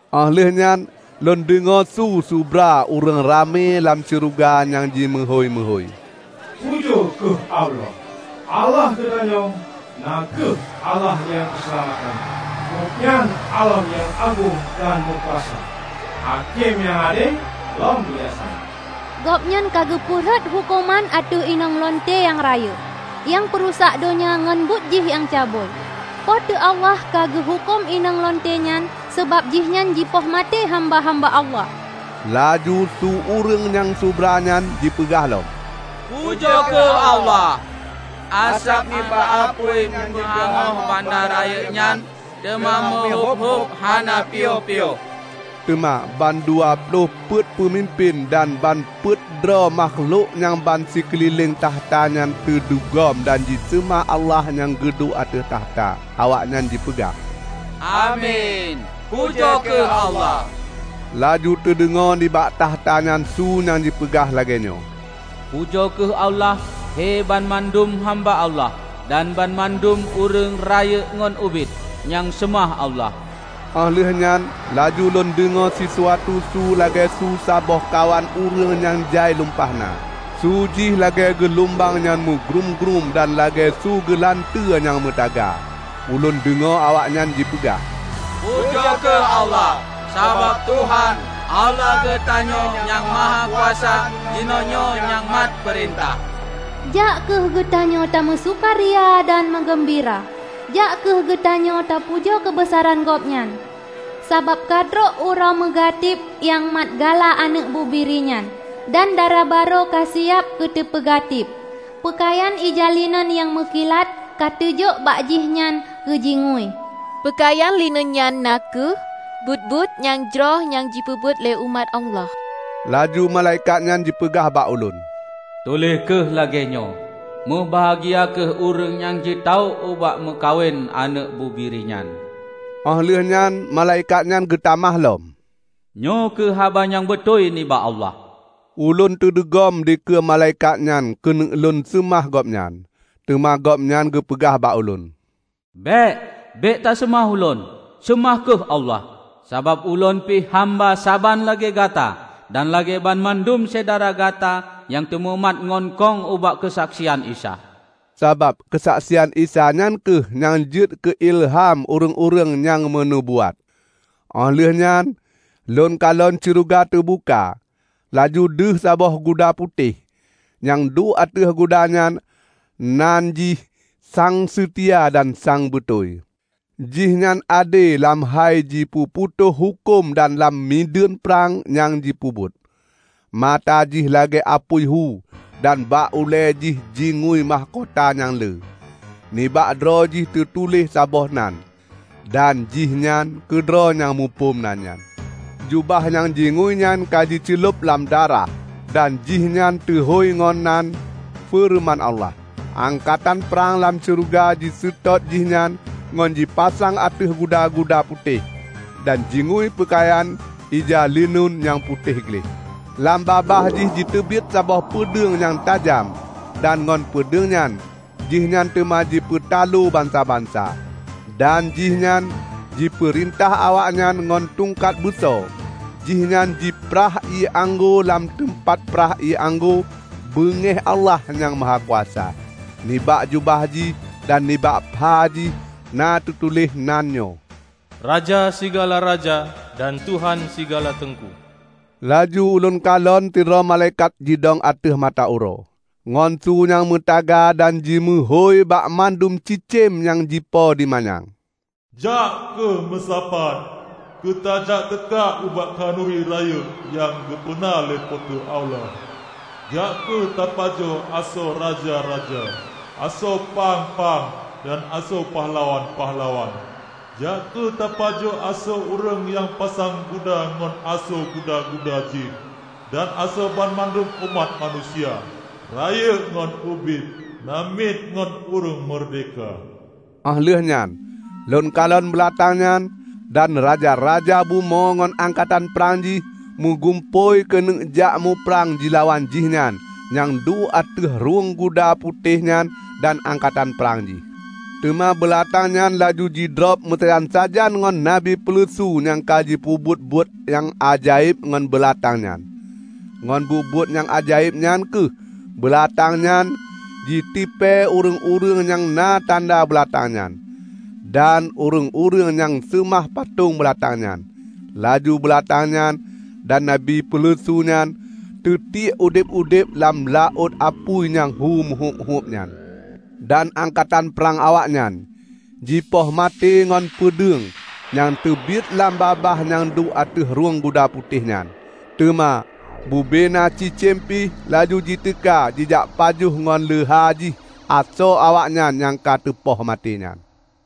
Óh lheueh nyan lôn deungoe su subra ureuëng ramé lam syeuruga nyang jimeuhôi-meuhôi, "Pujoe kheueh Allah! Allah geutanyoe na kheueh Allah nyang peuseulamat tanyoe; Gobnyan Allah nyang agong dan meukuasa! Hakém nyang ade lom bijaksana! Gobnyan ka geupeu rhot huköman ateueh inong lunte nyang rayeuk, nyang peurusak donya ngon buet jih nyang cabui. Po teu Allah ka geuhuköm inong lunte nyan, sabab jihnyan jipoh maté hamba-hamba Allah." Laju su ureuëng nyang subra nyan jipeugah lom, "Pujoe kheueh Allah! Asab nibak apui nyang jipeuhangôh banda rayeuk nyan teuma meuhúb-húb hana piyôh-piyôh!" Teuma ban dua ploh peuet peumimpén dan ban peuet droe makhlok nyang ban sikeulileng takhta nyan teudugom dam jiseumah Allah nyang geuduek ateueh takhta. Awaknyan jipeugah, "Amin! Pujoe kheueh Allah!" Laju teudeungoe nibak takhta nyan su nyang jipeugah lagée nyoe, "Pujoe kheueh Allah, he banmandum hamba Allah, dan banmandum ureuëng -- rayeuk ngon ubit -- nyang seumah Allah!" Óh lheueh nyan laju lôn deungoe sisuatu su lagée su saboh kawan ureuëng nyang jai lumpah na; su jih lagée geulumbang nyang meugrúm-grúm dan lagée su geulanteue nyang meutaga. Ulôn deungoe awaknyan jipeugah, "Pujoe kheueh Allah! Sabab Tuhan, Allah geutanyoe Nyang Mahakuasa jinoenyoe nyang mat peurintah! Jak kheueh geutanyoe tameusukaria dan meugeumbira; jak kheueh geutanyoe tapujoe keubeusaran Gobnyan! Sabab ka trok uroe meugatib nyang mat gala Aneuëk Bubiri nyan, dan darabarô ka siab keuteupeu gatib. Peukayan ija lineun nyang meukilat ka teujôk bak jihnyan keu jingui." (Peukayan lineun nyan na kheueh buet-buet nyang jroh nyang jipeubuet lé umat Allah.) Laju malaikat nyan jipeugah bak ulôn, "Tuléh kheueh lagée nyoe: 'Meubahgia kheueh ureuëng nyang ji-tawök ubak meukawen Aneuëk Bubiri nyan.' " Óh lheueh nyan malaikat nyan geutamah lom, "Nyoe kheueh haba nyang beutôi nibak Allah." Ulôn teudugom dikeue malaikat nyan keuneuk lôn seumah gobnyan, teuma gobnyan geupeugah bak lôn, "Bék! Bék taseumah ulôn, seumah kheueh Allah! Sabab ulôn pih hamba saban lagée gata dan lagée banmandum syedara gata nyang tamumat ngon kong ubak keusaksian Isa!" Sabab keusaksian Isa nyan kheueh nyang jeuet keu ileuham ureuëng-ureuëng nyang meunubuat. Óh lheueh nyan lôn kalon syeuruga teubuka, laju deuh saboh guda putéh. Nyang duek ateueh guda nyan nan jih Sang Seutia dan Sang Beutôi. Jihnyan ade lam hai jipeuputôh huköm dan lam mideuen prang nyang jipeubuet. Mata Jih lagée apui hu dan bak ulée Jih jingui mahkota nyang lé. Nibak droe Jih teutuléh saboh nan; dan Jihnyan keudroe nyang muphom nan nyan. Jubah nyang jingui nyan ka jiceulob lam darah. Dan Jihnyan teuhôi ngon nan "Feureuman Allah". Angkatan prang lam syeuruga jiseutôt Jihnyan ngon jipasang ateueh guda-guda putéh, dan jingui peukayan ija lineun nyang putéh gleh. Lam babah Jih jiteubiet saboh peudeueng nyang tajam dan ngon peudeueng nyan jihnyan teuma jipeutaloe bansa-bansa, dan Jihnyan jipeurintah awaknyan ngon tungkat beuso. Jihnyan jiprah ié anggô lam teumpat prah ié anggô beungéh Allah Nyang Mahakuasa. Nibak jubah Jih dan nibak pha Jih na teutuléh nan nyoe, "Raja sigala raja, dan Tuhan sigala teungku." Laju ulôn kalon sidroe malaikat jidong ateueh mata uroe. Ngon su nyang meutaga dan jimeuhôi bak mandum cicém nyang jipo di manyang, "Jak kheueh meusapat keu tajak teuka ubak khanuri rayeuk nyang geupeuna lé Po teu Allah! Jak kheueh tapajoh asoe raja-raja, asoe pang-pang, dan asoe pahlawan-pahlawan; jak kheueh tapajoh asoe ureuëng nyang pasang guda ngon asoe guda-guda jih dan asoe banmandum umat manusia, rayeuk ngon ubit, namiet ngon ureuëng meurdehka!" Óh lheueh nyan lôn kalon beulatang nyan, dan raja-raja bumoe ngon angkatan prang jih, meugumpôi keuneuk jak muprang jilawan Jihnyan nyang duek ateueh rhueng guda putéh nyan dan angkatan prang Jih. Teuma beulatang nyan laju teudrob meusajan-sajan ngon nabi peuleusu nyang ka jipeubuet buet nyang ajaéb ngon beulatang nyan. (Ngon buet-buet nyang ajaéb nyan kheueh beulatang nyan jitipée ureuëng-ureuëng nyang na tanda beulatang nyan, dan ureuëng-ureuëng nyang seumah patong beulatang nyan.) Laju beulatang nyan dan nabi peuleusu nyan teutiek udeb-udeb lam laôt apui nyang hu meuhúb-húb nyan. Dan angkatan prang awaknyan jipoh maté ngon peudeueng nyang teubiet lam babah nyang duek ateueh rhueng guda putéh nyan. Teuma bubena cicém pih laju jiteuka jijak pajoh ngon leuha jih asoe awaknyan nyang ka teupoh maté nyan.